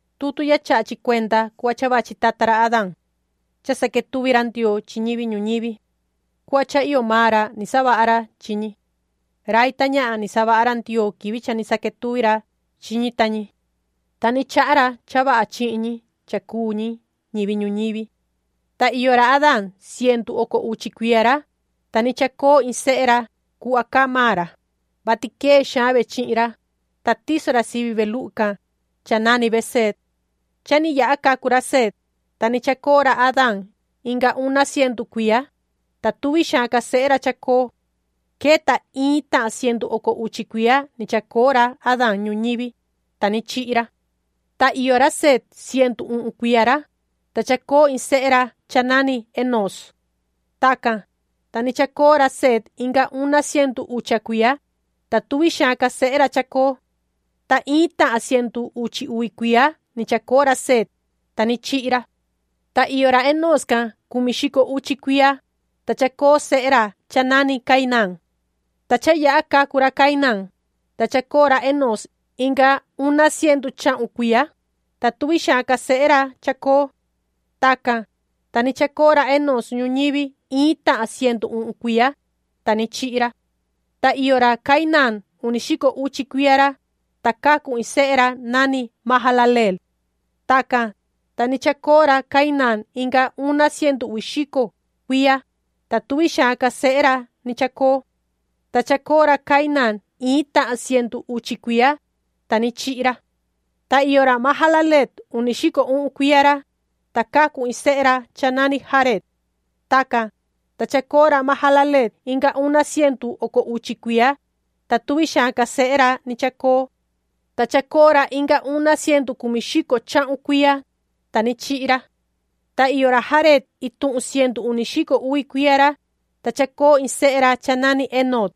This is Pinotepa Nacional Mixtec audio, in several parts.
Tutu ya chaha chi cuenda cuhva vachi tata ra Adaan. Cha saquetuvi ra Ndioo chi ñivi ñuñivi. Cuhva cha iyo maan ra ni savaha ra chi ñi. Rai ta ñahan ni savaha ra Ndioo quivi cha ni saquetuvi ra chi ñi ta ñi, ta ni chaha ra cha vaha chihin ñi cha cuu ñi ñivi ñuñivi. Ta iyo ra Adaan cientu oco uchi cuiya ra, ta ni chacoo in sehe ra cuhva caa maan ra, vati quee xaan ve chihin ra, ta tiso ra sivi ve luhu can, cha nani ve Seet. Cha ni yaha cacu ra Seet, ta ni chacoo ra Adaan inga una cientu cuiya, ta tuvi xaan ca sehe ra chacoo. Queta iin tahan cientu oco uchi cuiya ni chacoo ra Adaan ñuñivi, ta ni chihi ra. Ta iyo ra Seet cientu uhun cuiya ra, ta chacoo in sehe ra cha nani Enoos. Tacan, ta ni chacoo ra Seet inga una cientu ucha cuiya, ta tuvi xaan ca sehe ra chacoo. Ta iin tahan cientu uchi uvi cuiya ni chacoo ra Seet, ta ni chihi ra. Ta iyo ra Enoos can cumi xico uchi cuiya, ta chacoo sehe ra cha nani Cainaan. Ta cha yaha cacu ra Cainaan, ta chacoo ra Enoos inga una cientu chahun cuiya, ta tuvi xaan ca sehe ra chacoo. Tacan, ta ni chacoo ra Enoos ñuñivi iin tahan cientu uhun cuiya, ta ni chihi ra. Ta iyo ra Cainaan uni xico uchi cuiya ra, ta cacu in sehe ra nani Mahalaleel. Tacan, ta ni chacoo ra Cainaan inga una cientu uvi xico cuiya, ta tuvi xaan ca sehe ra ni chacoo. Ta chacoo ra Cainaan iin tahan cientu uchi cuiya, ta ni chihi ra. Ta iyo ra Mahalaleel uni xico uhun cuiya ra, ta cacu in sehe ra cha nani Jareed. Tacan, ta chacoo ra Mahalaleel inga una cientu oco uchi cuiya, ta tuvi xaan ca sehe ra ni chacoo. Ta chacoo ra inga una cientu cumi xico chahun cuiya, ta ni chihi ra. Ta iyo ra Jareed ituhun cientu uni xico uvi cuiya ra, ta chacoo iin sehe ra cha nani Enoc.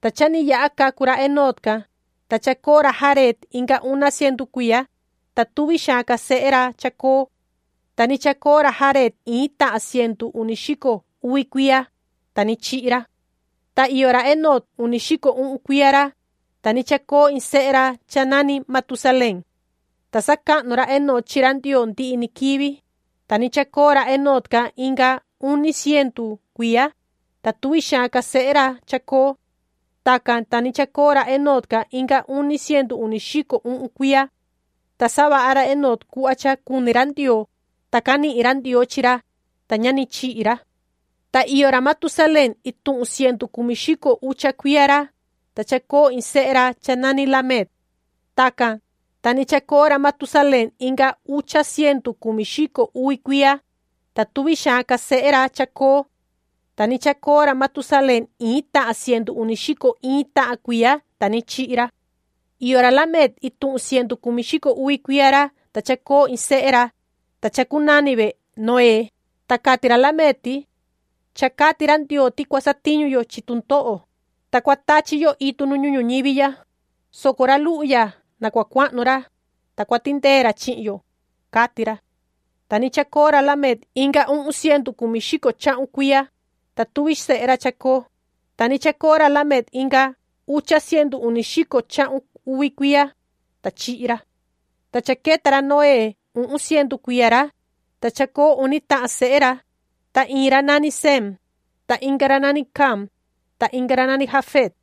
Ta cha ni yaha cacu ra Enoc can, ta chacoo ra Jareed inga una cientu cuiya, ta tuvi xaan ca sehe ra chacoo. Ta ni chacoo ra Jareed iin tahan cientu uni xico uvi cuiya, ta ni chihi ra. Ta iyo ra Enoc uni xico uhun cuiya ra, ta ni chacoo iin sehe ra cha nani Matusalén. Ta sacahnu ra Enoc chi ra Ndioo ndihi ni quivi, ta ni chacoo ra Enoc can inga uni cientu cuiya, ta tuvi xaan ca sehe ra chacoo. Tacan, ta ni chacoo ra Enoc inga uni cientu uni xico uhun cuiya. Ta savaha ra Enoc cuhva cha cuni ra Ndioo, ta canihin ra Ndioo chi ra, ta ña ni chihi ra. Ta iyo ra Matusalén ituhun cientu cumi xico ucha cuiya ra, ta chacoo iin sehe ra cha nani Lamec. Tacan, ta ni chacoo ra Matusalén inga ucha cientu cumi xico uvi cuiya, ta tuvi xaan ca sehe ra chacoo. Ta ni chacoo ra Matusalén iin tahan cientu uni xico iin tahan cuiya, ta ni chihi ra. Iyo ra Lamec ituhun cientu cumi xico uvi cuiya ra ta chacoo iin sehe ra, ta chacunani ve Noé, ta cati ra Lamec ti: “Cha cati ra Ndioo ti cua satiñu yo chi tundoho, ta cua tachi yo itu nu ñuhun ñuñivi ya, soco ra luhu ya na cua cuahnu ra, ta cua tindee ra chihin yo”, cati ra. Ta ni chacoo ra Lamec inga uhun cientu cumi xico chahun cuiya, ta tuvi sehe ra chacoo. Ta ni chacoo ra Lamec inga ucha cientu uni xico chahun uvi cuiya, ta chihi ra. Ta cha queta ra Noé uhun cientu cuiya ra, ta chacoo uni tahan sehe ra, ta iin ra nani Sem, ta inga ra nani Cam, ta inga ra nani Jafet.